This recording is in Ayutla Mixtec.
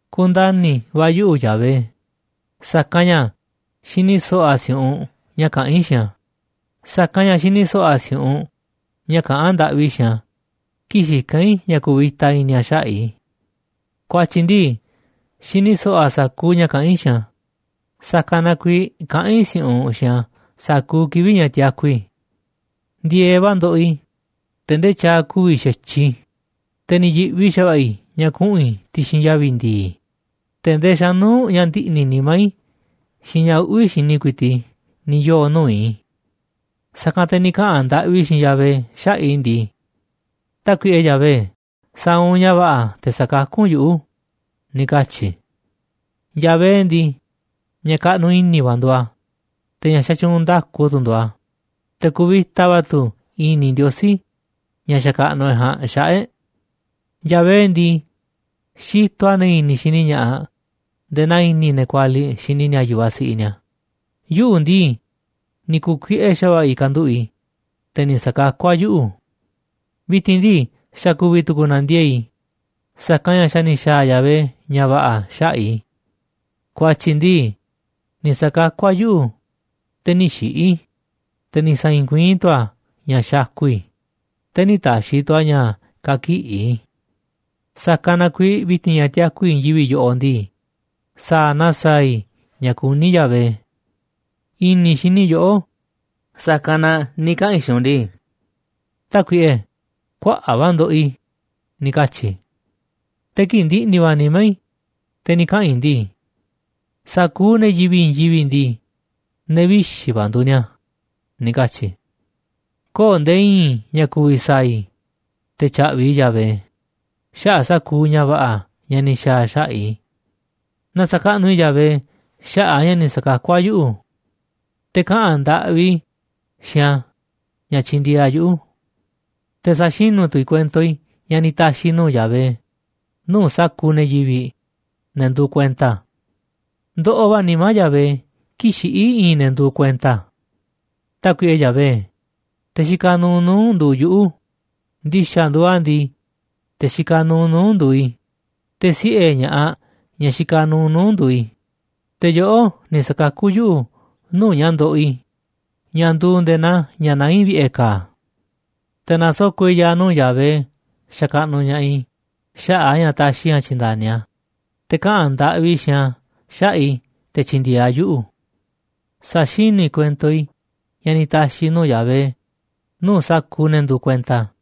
Kundani̱ va̱ yuꞌu̱ Yahvé, sa̱kanꞌ ña̱ xini so̱ꞌo̱ a̱ si̱u̱ꞌunꞌ ña̱ kaꞌán i̱ xiinꞌ a̱, sa̱kanꞌ ña̱ xini so̱ꞌo̱ a̱ si̱u̱ꞌunꞌ ña̱ kaꞌán ndaꞌvi i̱ xiinꞌ a̱ kii̱ꞌ xikán i̱ ña̱ ku̱vi̱ta i̱ni̱ a̱ xaꞌa̱ꞌ i̱. Ku̱a̱tyi̱ ndii, xini so̱ꞌo̱ a̱ sa̱kuuꞌ ña̱ kaꞌán i̱ xiinꞌ a̱, sa̱kanꞌ na kuiiꞌ kaꞌán i̱ si̱u̱ꞌunꞌ xiinꞌ a̱ sa̱kuuꞌ kivi̱ꞌ ña̱ tiaku i̱. Ndi̱e̱eꞌ va̱ ndoꞌoꞌ i̱, te̱ ndee tyaaꞌ ku̱vi̱ xa̱tyiꞌ i̱, te̱ ni̱ yi̱ꞌvi xa̱va̱ꞌa̱ i̱ ña̱ kuꞌu̱n i̱ ti̱xi̱n yavi̱ ndi̱i̱, te̱ ndee xa̱nuu̱ꞌ ña̱ ndiꞌni̱ nimá i̱ xiinꞌ ña̱ uꞌvi̱ xini ku̱i̱ti̱ꞌ i̱ ni̱ yoo̱ nuu̱ꞌ i̱. Sa̱kanꞌ te̱ ni̱ kaꞌa̱n ndaꞌvi i̱ xiinꞌ Yahvé xaꞌa̱ꞌ i̱ ndii: “Tákuiꞌe Yahvé, sa̱a̱ u̱nꞌ ña̱ va̱ꞌa̱ te̱ sa̱kakú u̱nꞌ yuꞌu̱”, ni̱ katyi̱ i̱. Yahvé ndii, ña̱ kaꞌnuꞌ i̱ni̱ va̱ nduuꞌ a̱, te̱ ña̱ xatyuunꞌ nda̱ku tu̱ nduuꞌ a̱, te̱ kuvita va̱ tu̱ i̱ni̱ Ndiosí, ña̱ xakaꞌnuꞌ e̱ꞌ ja̱a̱nꞌ, xaꞌa̱ꞌ e̱ꞌ. Yahvé ndii, xitoꞌ a̱ ne̱ i̱ni̱ xini ña̱ꞌaꞌ nde̱e̱ naa i̱ni̱ ne̱ kualiꞌ xini ni̱a̱ yu̱vaꞌ siꞌiꞌ ni̱a̱, yuꞌu̱ ndii, ni̱ ku̱kuiꞌe xa̱va̱ꞌa̱ i̱ kanduꞌu̱ꞌ i̱, te̱ ni̱ sa̱kakú a̱ yuꞌu̱. Vi̱ti̱n ndii, xa̱ ku̱vi̱ tu̱ku̱u̱ nandiee̱ꞌ i̱, sa̱kanꞌ ña̱ xa̱ ni̱ xa̱a̱ Yahvé ña̱ va̱ꞌa̱ xaꞌa̱ꞌ i̱. Ku̱a̱tyi̱ ndii, ni̱ sa̱kakú a̱ yuꞌu̱ te̱ nï̱ xiꞌi̱ i̱, te̱ ni̱ sa̱i̱i̱n kuiín tu̱ a̱ ña̱ xakuꞌ i̱, te̱ nï̱ ta̱xi̱ tu̱ a̱ ña̱ ka̱kiꞌi̱ i̱. Sa̱kanꞌ na kuiiꞌ vi̱ti̱n ña̱ tiaku i̱ i̱i̱n yivi̱ꞌ yoꞌoꞌ ndii, sa̱a̱ na sa̱a̱ i̱ ña̱ kuní Yahvé. I̱ni̱ xini i̱ yoꞌó, sa̱kanꞌ na ni̱ kaꞌa̱n i̱ xiinꞌ u̱nꞌ ndii: “Tákuiꞌe, kuaꞌa̱ꞌ va̱ ndoꞌoꞌ i̱”, ni̱ katyi̱ i̱. Te̱ kii̱ꞌ ndiꞌni̱ va̱ nimá i̱, te̱ ni̱ kaꞌa̱n i̱ ndii: “Sa̱kuuꞌ ne̱ yivi̱ꞌ i̱i̱n yivi̱ꞌ ndii, ne̱ vixi̱ va̱ nduuꞌ ni̱a̱”, ni̱ katyi̱ i̱. Köo̱ꞌ nde̱e̱ i̱i̱n ña̱ ku̱vi̱ sa̱a̱ i̱ te̱ tya̱ꞌvi̱ i̱ Yahvé xaꞌa̱ꞌ sa̱kuuꞌ ña̱ va̱ꞌa̱ ña̱ ni̱ xa̱a̱ a̱ xaꞌa̱ꞌ i̱. Na sa̱kaꞌnuꞌ i̱ Yahvé xaꞌa̱ꞌ a̱ ña̱ ni̱ sa̱kakú a̱ yuꞌu̱, te̱ kaꞌa̱n ndaꞌvi i̱ xiinꞌ a̱ ña̱ tyindieeꞌ a̱ yuꞌu̱. Te̱ sa̱xinú tu̱ i̱ kuento i̱ ña̱ ni̱ ta̱xi̱ i̱ nuu̱ꞌ Yahvé nuu̱ꞌ sa̱kuuꞌ ne̱ yivi̱ꞌ, ne̱ nduuꞌ kuenta a̱. Ndoꞌoꞌ va̱ nimá Yahvé kii̱ꞌ xiꞌí i̱i̱n ne̱ nduuꞌ kuenta a̱. Tákuiꞌe Yahvé, te̱ xikaꞌ nuuꞌ nuu̱ꞌ u̱nꞌ nduuꞌ yuꞌu̱, ndi̱xa̱ nduuꞌ a̱ ndii, te̱ xikaꞌ nuuꞌ nuu̱ꞌ u̱nꞌ nduuꞌ i̱, te̱ siꞌe̱ ña̱ꞌaꞌ, ñaꞌ xikaꞌ nuuꞌ nuu̱ꞌ u̱nꞌ nduuꞌ i̱, te̱ yoꞌó ni̱ sa̱kakú yuꞌu̱ nuu̱ꞌ ña̱ ndoꞌoꞌ i̱, ña̱ nduuꞌ nde̱e̱ naa ña̱ naá i̱ vi̱ꞌe̱ ka̱a̱. Te̱ na̱soko̱ꞌ i̱ ya̱a̱ nuu̱ꞌ Yahvé xakaꞌnuꞌ ña̱ꞌaꞌ i̱ xaꞌa̱ꞌ a̱ ña̱ taxiꞌ i̱ ña̱ tyi̱nda̱ni a̱, te̱ kaꞌa̱n ndaꞌvi i̱ xiinꞌ a̱ xaꞌa̱ꞌ i̱ te̱ tyi̱ndi̱e̱eꞌ a̱ yuꞌu̱. Sa̱xinú i̱ kuento i̱ ña̱ ni̱ ta̱xi̱ i̱ nuu̱ꞌ Yahvé nuu̱ꞌ sa̱kuuꞌ ne̱ nduuꞌ kuenta a̱,